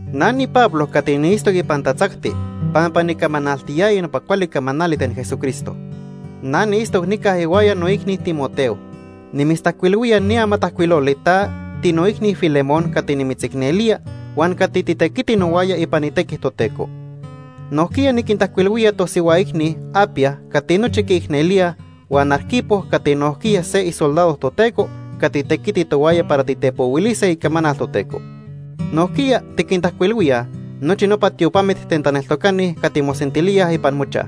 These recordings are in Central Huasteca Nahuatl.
Na niPablo cati niitztoc ipan tatzacti pampa nicamanaltiyaya nopa cuali camanali ten Jesucristo. Na niitztoc nica ihuaya noicni Timoteo. Nimitztajcuilhuía ni amatajcuiloli ta, tinoicni Filemón cati nimitzicnelía huan cati titequiti nohuaya ipan itequi Toteco. Nojquiya niquintajcuilhuía tosihua icni Apia cati nochi quiicnelíaj, huan Arquipo cati nojquiya se isoldado Toteco cati tequiti tohuaya para titepohuilise icamanal Toteco. Nojquiya tiquintajcuilhuíaj nochi nopa tiopamit ten taneltocani cati mosentilíaj ipan mochaj.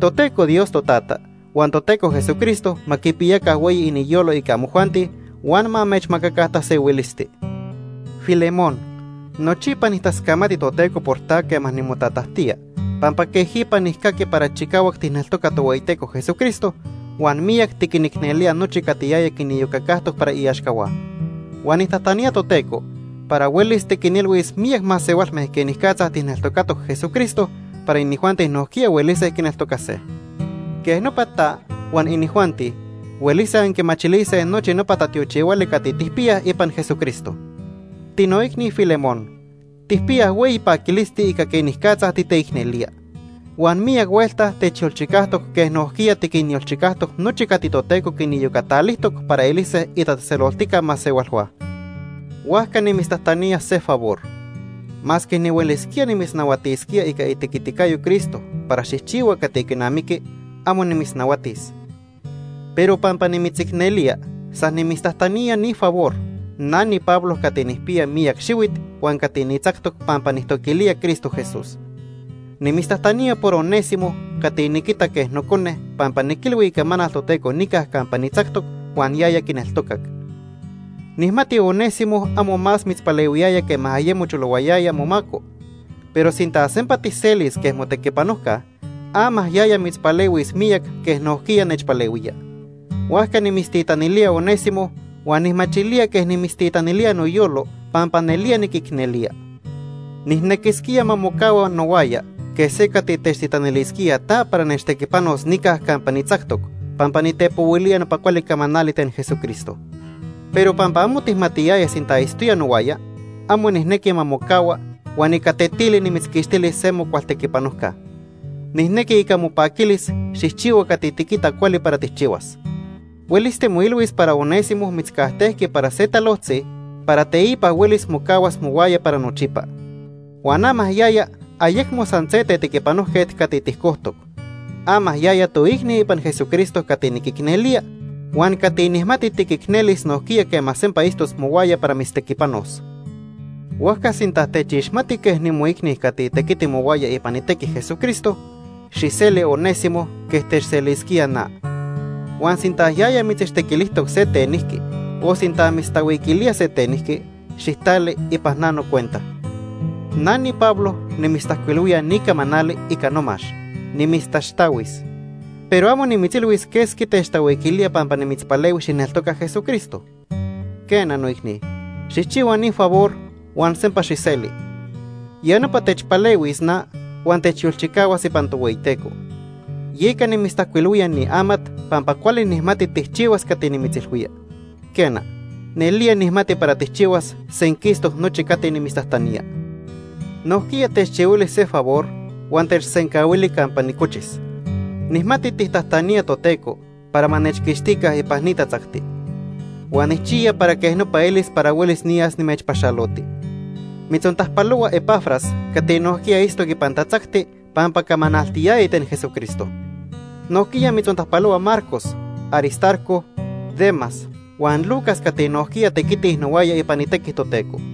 Toteco Dios Totata huan Toteco Jesucristo ma quipiyaca hueyi iniyolo ica amojuanti huan ma amechmacaca tasehuilisti. Filemón, nochipa nijtascamati Toteco por ta quema nimotatajtía, pampa quejipa nijcaqui para chicahuac tijneltoca Tohueyiteco Jesucristo huan miyac tiquinicnelía nochi cati yaya quiniyocacajtoc para iaxcahua. Huan nijtajtanía Toteco para huelis tiquinilhuis miyac masehualme quenicatza tijneltocatoc Jesucristo para inijuanti nojquiya huelise quineltocase. Quej nopa ta huan inijuanti huelise anquimachilise nochi nopa tatiochihuali cati tijpiyaj ipan Jesucristo. Tinoicni Filemón, tijpiyaj hueyi paquilisti ica quenicatza titeicnelía. Huan miyac huelta techyolchicajtoc quej nojquiya tiquinyolchicajtoc nochi cati Toteco quiniyocatalijtoc para elise itatzejtzeloltica masehualhua. Huajca nimitztajtanía se favor. Masque nihuelisquía nimitznahuatisquía ica itequiticayo Cristo para xijchihua cati quinamiqui, amo nimitznahuatis. Pero pampa nimitzicnelía, san nimitztajtanía ni favor, na niPablo cati nijpiya miyac xihuit huan cati nitzactoc pampa nijtoquilía Cristo Jesús. Nimitztajtanía por Onésimo cati niquita quej nocone pampa niquilhui icamanal Toteco nica campa nitzactoc huan yaya quineltocac. Nijmati Onésimo amo más mitzpalehuiyaya quema ayemo cholohuayaya momaco, pero sinta sempa tijselis quej motequipanojca, ama yaya mitzpalehuis miyac quej nojquiya nechpalehuía. Huajca nimitztitanilía Onésimo huan nijmachilía quej nimitztitanilía noyolo pampa nelía niquicnelía. Nijnequisquía ma mocahua nohuaya quej se cati techtitanilisquía ta para nechtequipanos nica campa nitzactoc pampa nitepohuilía nopa cuali camanali ten Jesucristo. Pero pampa amo tijmatiyaya sinta itztoya nohuaya, amo nijnequi ma mocahua huan ica tetili nimitzquixtilis se mocual tequipanojca. Nijnequi ica mopaquilis xijchihua cati tiquita cuali para tijchihuas. Huelis timoilhuis para Onésimo mitzcajtejqui para se talojtzi para teipa huelis mocahuas mohuaya para nochipa. Huan ama yaya ayecmo san se tequipanojquet cati tijcojtoc. Ama yaya toicni ipan Jesucristo cati niquicnelía huan cati nijmati tiquicnelis nojquiya quema sempa itztos mohuaya para mitztequipanos. Huajca sinta techixmati quej nimoicni cati tequiti mohuaya ipan itequi Jesucristo, xijseli Onésimo quej techselisquía. Huan sinta yaya mitzichtequilijtoc se tenijqui o sinta mitztahuiquilía se tenijqui, xijtali ipan na nocuenta. Na niPablo nimitztajcuilhuía ni camanali ica nomax: Nimitztaxtahuis. Pero amo nimitzilhuis quesqui techtahuiquilía pampa nimitzpalehui xijneltoca Jesucristo. Quena noicni, xijchihua ni favor huan sempa xijseli. Ya nopa techpalehuis na huan techyolchicahuas ipan Tohueyiteco. Yeca nimitztajcuilhuilía ni amat pampa cuali nijmati tijchihuas cati nimitzilhuía. Quena, nelía nijmati para tijchihuas senquistoc nochi cati nimitztajtanía. Nojquiya techchihuili se favor huan techsencahuili campa nicochis. Nijmati tijtajtanía Toteco para ma nechquixtica ipan ni tatzacti. Huan nijchiya para quej nopa elis para huelis niyas nimechpaxaloti. Mitzontajpalohua Epafras cati nohuaya itztoc ipan tatzacti pampa camanaltiyaya ten Jesucristo. Nojquiya mitzontajpalohua Marcos, Aristarco, Demas huan Lucas cati nojquiya tequitij nohuaya ipan itequi Toteco.